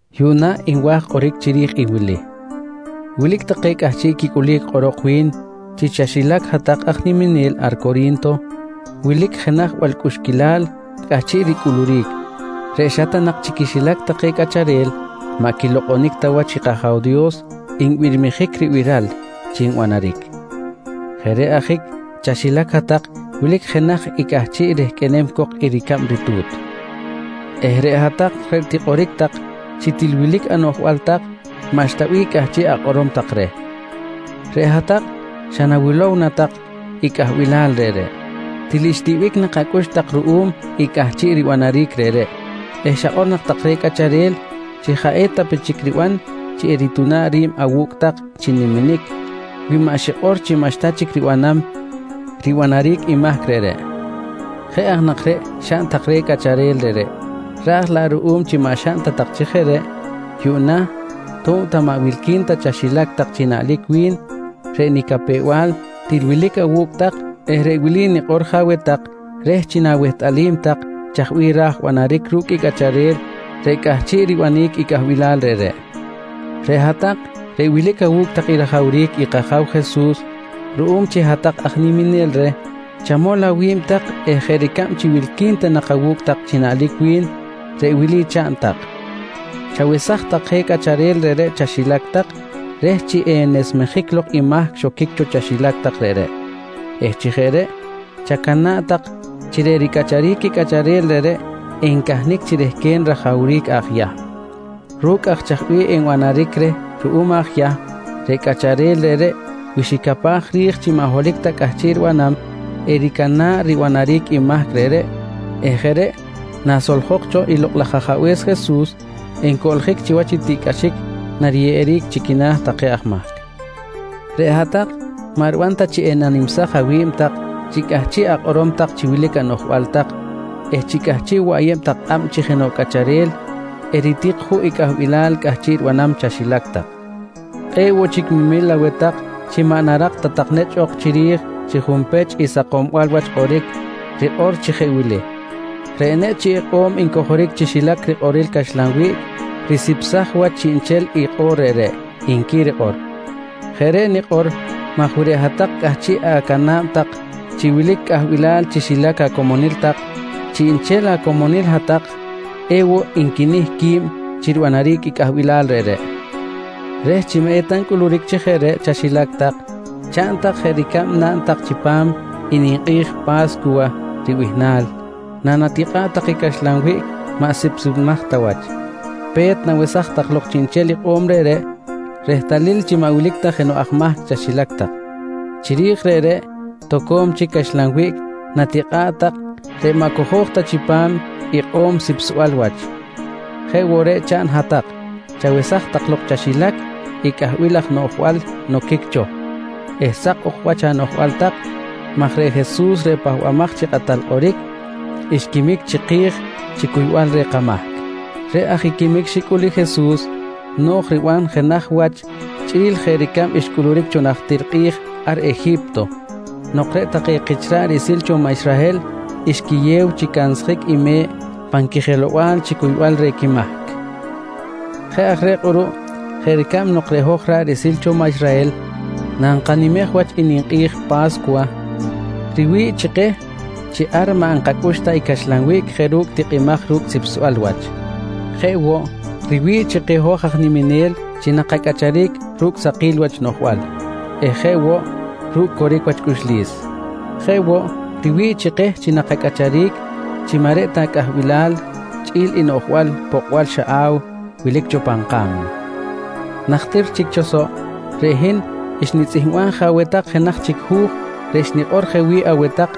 Yuꞌna nwa̱j kꞌoric chiri̱j i wili: Wilic take cꞌahchiꞌ quicꞌulic kꞌorok wi̱n chi chaxilac hat-tak aj niminel ar Cori̱nto wilic jenaj balcꞌuxquilal cꞌahchiꞌ ricꞌuluric reꞌ xa ta nak chi quixilac take cꞌacharel maꞌ quilokꞌonic ta wach i kAja̱w Dios nbirmijic ribiral chi nbanaric. Jeꞌ reꞌ ajic chaxilac hat-tak wilic jenaj i cꞌahchiꞌ rehqꞌuenem cok i ricab ritu̱t eh reꞌ hat-tak reꞌ tikꞌoric tak chi til wilic anoꞌjbal tak, maꞌxta bih cꞌahchiꞌ akꞌorom tak reh. Reꞌ hat-tak naxawilow nak tak i cꞌahbilal reꞌreꞌ, til xtiꞌbic nak acꞌux tak ruꞌum i cꞌahchiꞌ ribanaric reꞌreꞌ eh xakꞌor nak tak reh cꞌacharel chi jaꞌ eta pe chic riban chi erituna̱ꞌ ri̱b awu̱cꞌ tak chi niminic wi maꞌ xikꞌor chi maꞌxta chic ribanam ribanaric i mahc reꞌreꞌ. Jeꞌ aj nak reꞌ xaꞌn tak reh cꞌacharel reꞌreꞌ, raj laꞌ ruꞌum chi maꞌ xaꞌn ta tak chi jeꞌ reꞌ, yuꞌna tob ta maꞌ wilqui̱n ta chaxilac tak chi naꞌlic wi̱n reꞌ nicapew-bal til wilic awu̱cꞌ tak eh reꞌ wili nikꞌor je aweh tak reh chi na̱wehtꞌalim tak chaj bih ra̱j banaric ru̱cꞌ i cꞌacharel reꞌ cꞌahchiꞌ ribanic i cꞌahbilal reꞌreꞌ: Reꞌ hat-tak reꞌ wilic awu̱cꞌ tak i rajawric i kAja̱w Jesus ruꞌum chi hat-tak aj niminel reh, chamol awi̱b tak eh jeꞌ ricab chi wilqui̱n ta nak awu̱cꞌ tak chi naꞌlic wi̱n, reꞌ wili chaꞌn tak: Chawesaj tak je cꞌacharel reꞌreꞌ chaxilac tak reh chi enesmejic lok i mahc xoquic cho chaxilac tak reꞌreꞌ eh chi jeꞌ reꞌ chacana̱ꞌ tak chi reꞌ ricꞌacharic i cꞌacharel reꞌreꞌ encahnic chi rehquen rajawric aj Yahm. Ru̱cꞌ aj chaj bih enbanaric reh ruꞌum aj Yahm, reꞌ cꞌacharel reꞌreꞌ wi xicapaj ri̱j chi maꞌ holohic ta cꞌahchiꞌ ribanam, ericana̱ꞌ i ribanaric i mahc reꞌreꞌ eh jeꞌ reꞌ nasoljok cho i Lokꞌ laj Ajabe̱s Jesus encoꞌljic chiwach i tiꞌcꞌaxic nariyeꞌeric chi quina̱ take aj mahc. Reꞌ hat-tak maꞌ riban ta chi enanimsaj awi̱b tak chi cꞌahchiꞌ akꞌorom chi wilic anoꞌjbal tak eh chi cꞌahchiꞌ woꞌ ayeb tak kꞌab chi jenoꞌ cꞌacharel eritik juꞌ i cꞌahbilal cꞌahchiꞌ ribanam chaxilac tak. Kꞌe̱ꞌ woꞌ chic memil aweh tak chi maꞌ narak ta tak nechꞌ ok chiri̱j chi junpech i sakombal wach kꞌoric rikꞌor chi jeꞌ wili: “Reꞌ nechꞌ chi ikꞌo̱m ncojoric chi xilac rikꞌoril caxlan wiꞌc, risipsaj wach chiꞌnchel i kꞌo̱r reꞌreꞌ, nqui rikꞌor. Jeꞌ reꞌ nikꞌor maj wi reꞌ hat-tak cꞌahchiꞌ acana̱b tak chi wilic cꞌahbilal chi xilac acomonil tak, chiꞌnchel acomonil hat-tak ewoꞌ nquinih qui̱b chi ribanaric cꞌahbilal reꞌreꞌ. Reh chi maꞌeta ncꞌuluric chi jeꞌ reꞌ chaxilac tak, chaꞌn tak jeꞌ ricab naꞌn tak chipam i ninkꞌi̱j Pa̱scuwa ribihnal nanatikꞌa̱ꞌ tak i caxlan wiꞌc maꞌ sipsimaj ta wach. Pe̱t, nawesaj tak lok chiꞌnchel ikꞌo̱m reꞌreꞌ, rehtalil chi maꞌ wilic ta jenoꞌ aj mahc chaxilac tak. Chiri̱j reꞌreꞌ, toco̱m chic caxlan wiꞌc natikꞌa̱ꞌ tak reꞌ maꞌ cojo̱j ta chipam ikꞌo̱m sipsbal wach. Jeꞌ woꞌ reꞌ chaꞌn i hat-tak, chawesaj tak lok chaxilac i cꞌahbil laj noꞌjbal noquic cho eh sak ok wach anoꞌjbal tak maj reꞌ Jesus reꞌ Pahbamaj chi Kꞌatal Kꞌoric xquimic chiki̱j chi cuybal reh kamahc. Reꞌ aj i quimic xicꞌul i Jesus no̱j riban jenaj wach chꞌi̱l jeꞌ ricab xcꞌuluric cho najtir kꞌi̱j ar Eji̱pto nok reꞌ take kich ra̱ꞌ riꞌsil cho maꞌ Israhel xquiyew chi cansjic i me̱ꞌ pan quijelow-bal chi cuybal reh quimahc. Jeꞌ aj reꞌ kꞌuruꞌ jeꞌ ricab nok reꞌ hoj ra̱ꞌ riꞌsil cho maꞌ Israhel nankanimej wach i ninkꞌi̱j Pa̱scuwa, riwi̱ꞌ chi keh chi ar maꞌ nkacꞌux ta i caxlan wiꞌc jeꞌ ru̱cꞌ tikꞌimaj ru̱cꞌ sipsbal wach, jeꞌ woꞌ riwi̱ꞌ chi keh hoj aj niminel chi nakacꞌacharic ru̱cꞌ sakil wach noꞌjbal eh jeꞌ woꞌ ru̱cꞌ coric wach cꞌuxlis. Jeꞌ woꞌ, riwi̱ꞌ chi keh chi nakacꞌacharic chi maꞌ reꞌ ta cꞌahbilal chꞌi̱l i noꞌjbal pokꞌbal xaꞌaw wilic cho pan ka̱mna. Najtir chic cho soꞌ, reꞌ hin xnitzꞌihmbaj je aweh tak jenaj chic hu̱j reꞌ xnikꞌor je wi̱ꞌ aweh tak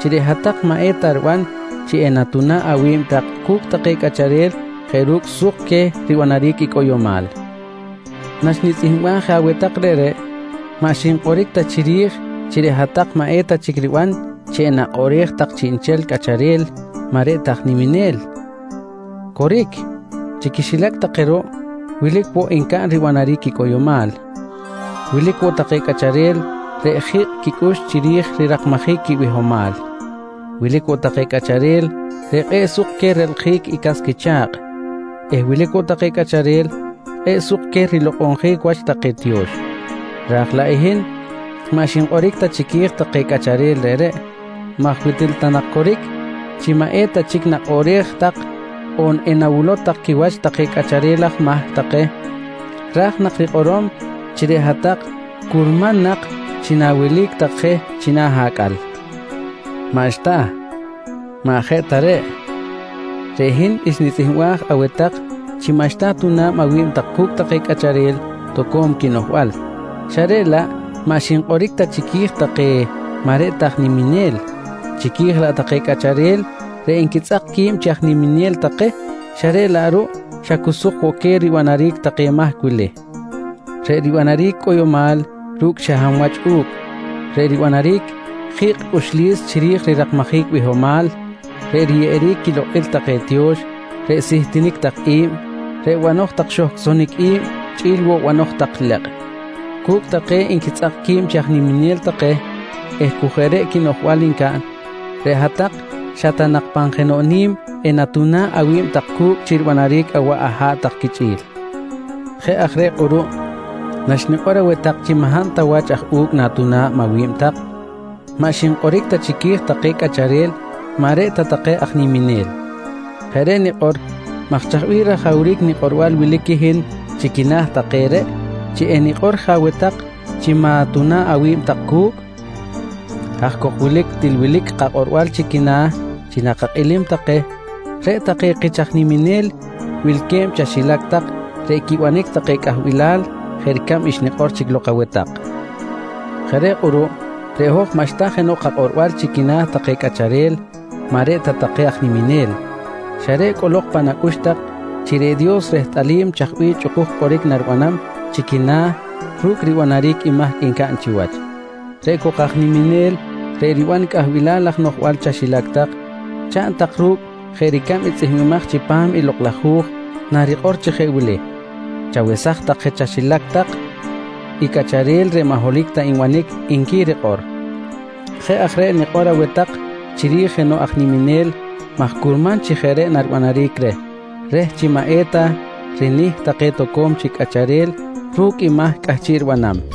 chi reꞌ hat-tak maꞌ eta riban chi enatuna̱ꞌ awi̱b tak cu̱cꞌ take cꞌacharel jeꞌ ru̱cꞌ suk queh ribanaric i cꞌoyomal. Naxnitzꞌihmbaj je aweh tak reꞌreꞌ, maꞌ xinkꞌoric ta chiri̱j chi reꞌ hat-tak maꞌ eta chic riban chi enakꞌoꞌrej tak chiꞌnchel cꞌacharel maꞌ reꞌ ta take aj niminel. Coric, chi quixilac take ruꞌ wilic woꞌ ncaꞌn ribanaric i cꞌoyomal. Wilic woꞌ take cꞌacharel reꞌ ji̱kꞌ quicꞌux chiri̱j rirakmajic quibihomal. Wilic woꞌ take cꞌacharel reꞌ kꞌe̱ꞌ suk queh relkꞌjic i cas quicha̱kꞌ eh wilic woꞌ take cꞌacharel kꞌe̱ꞌ suk queh rilokꞌonjic wach take tiyo̱x. Raj laꞌ hin maꞌ xinkꞌoric ta chiqui̱j take cꞌacharel reꞌreꞌ maj wi til ta nak coric chi maꞌ eta chic nakꞌoꞌrej tak on enawilow tak quiwach take cꞌacharel aj mahc take, ra̱j nak rikꞌorom chi reꞌ hat-tak curman nak chi na̱welic tak je china̱ acꞌal. Maꞌxta, maꞌ jeꞌ ta reꞌ. Reꞌ hin xnitzꞌihmbaj aweh tak chi maꞌxta atuna̱b awi̱b tak cu̱cꞌ take cꞌacharel toco̱m quinoꞌjbal xa reꞌ laꞌ maꞌ xinkꞌoric ta chiqui̱j take maꞌ reꞌ ta take aj niminel, chiqui̱j laꞌ take cꞌacharel reꞌ nquitzꞌak qui̱b chi aj niminel take xa reꞌ laꞌ ruꞌ xa cu suk woꞌ queh ribanaric take mahc wili: Reꞌ ribanaric cꞌoyomal ru̱cꞌ xa hab wach u̱cꞌ, reꞌ ribanaric ji̱kꞌ cꞌuxlis chiri̱j rirakmajic bihomal, reꞌ riyeꞌeric quilokꞌil take tiyo̱x, reꞌ sihtinic tak i̱b, reꞌ banoj tak xohcꞌsonic i̱b chꞌi̱l woꞌ banoj tak lekꞌ. Cu̱cꞌ take nquitzꞌak qui̱b chi aj niminel take eh cu jeꞌ reꞌ noꞌjbal ncaꞌn, reꞌ hat-tak xa ta nak pan jenoꞌ ni̱m enatuna̱ꞌ awi̱b tak cu̱cꞌ chi ribanaric awaꞌ aha̱ꞌ tak quichꞌi̱l. Jeꞌ aj reꞌ kꞌuruꞌ naxnikꞌor aweh tak chi maꞌ hab ta wach aj u̱cꞌ na̱tuna̱b awi̱b tak, maꞌ xinkꞌoric ta chiqui̱j take cꞌacharel maꞌ reꞌ ta take aj niminel. Jeꞌ reꞌ nikꞌor maj chaj bih rajawric nikꞌorbal wilic i hin chi quina̱ take reꞌ chi enikꞌor je aweh tak chi ma̱tuna̱ꞌ awi̱b tak cu̱cꞌ? Haj cok wilic til wilic kakꞌorbal chi quina̱ chi nakakꞌilim take, reꞌ take kich aj niminel wilque̱b chi kaxilac reꞌ quibanic take cꞌahbilal jeꞌ ricab xnikꞌor chic lok aweh tak. Jeꞌ reꞌ kꞌuruꞌ reꞌ hoj maꞌxta jenoꞌ kakꞌorbal chi quina̱ take cꞌacharel maꞌ reꞌ ta take aj niminel xa reꞌ cꞌolok pan kacꞌux chi reꞌ Dios rehtꞌalim chaj bih chꞌukuj kꞌoric naribanam chi quina̱ ru̱cꞌ ribanaric i mahc ncaꞌn chiwach. Reꞌ cok aj niminel reꞌ riban i cꞌahbilal laj noꞌjbal chaxilac tak, chaꞌn tak ru̱cꞌ jeꞌ ricab i tzꞌihmbimaj chipam i Lokꞌ laj Hu̱j narikꞌor chi jeꞌ wili: “Chawesaj tak je chaxilac tak i cꞌacharel reꞌ maꞌ holohic ta nbanic, nqui rikꞌor. Jeꞌ aj reꞌ nikꞌor je aweh tak chiri̱j jenoꞌ aj niminel maj curman chi jeꞌ reꞌ naribanaric reh, reh chi maꞌ eta rinih take toco̱m chic cꞌacharel ru̱cꞌ i mahc cꞌahchiꞌ ribanam.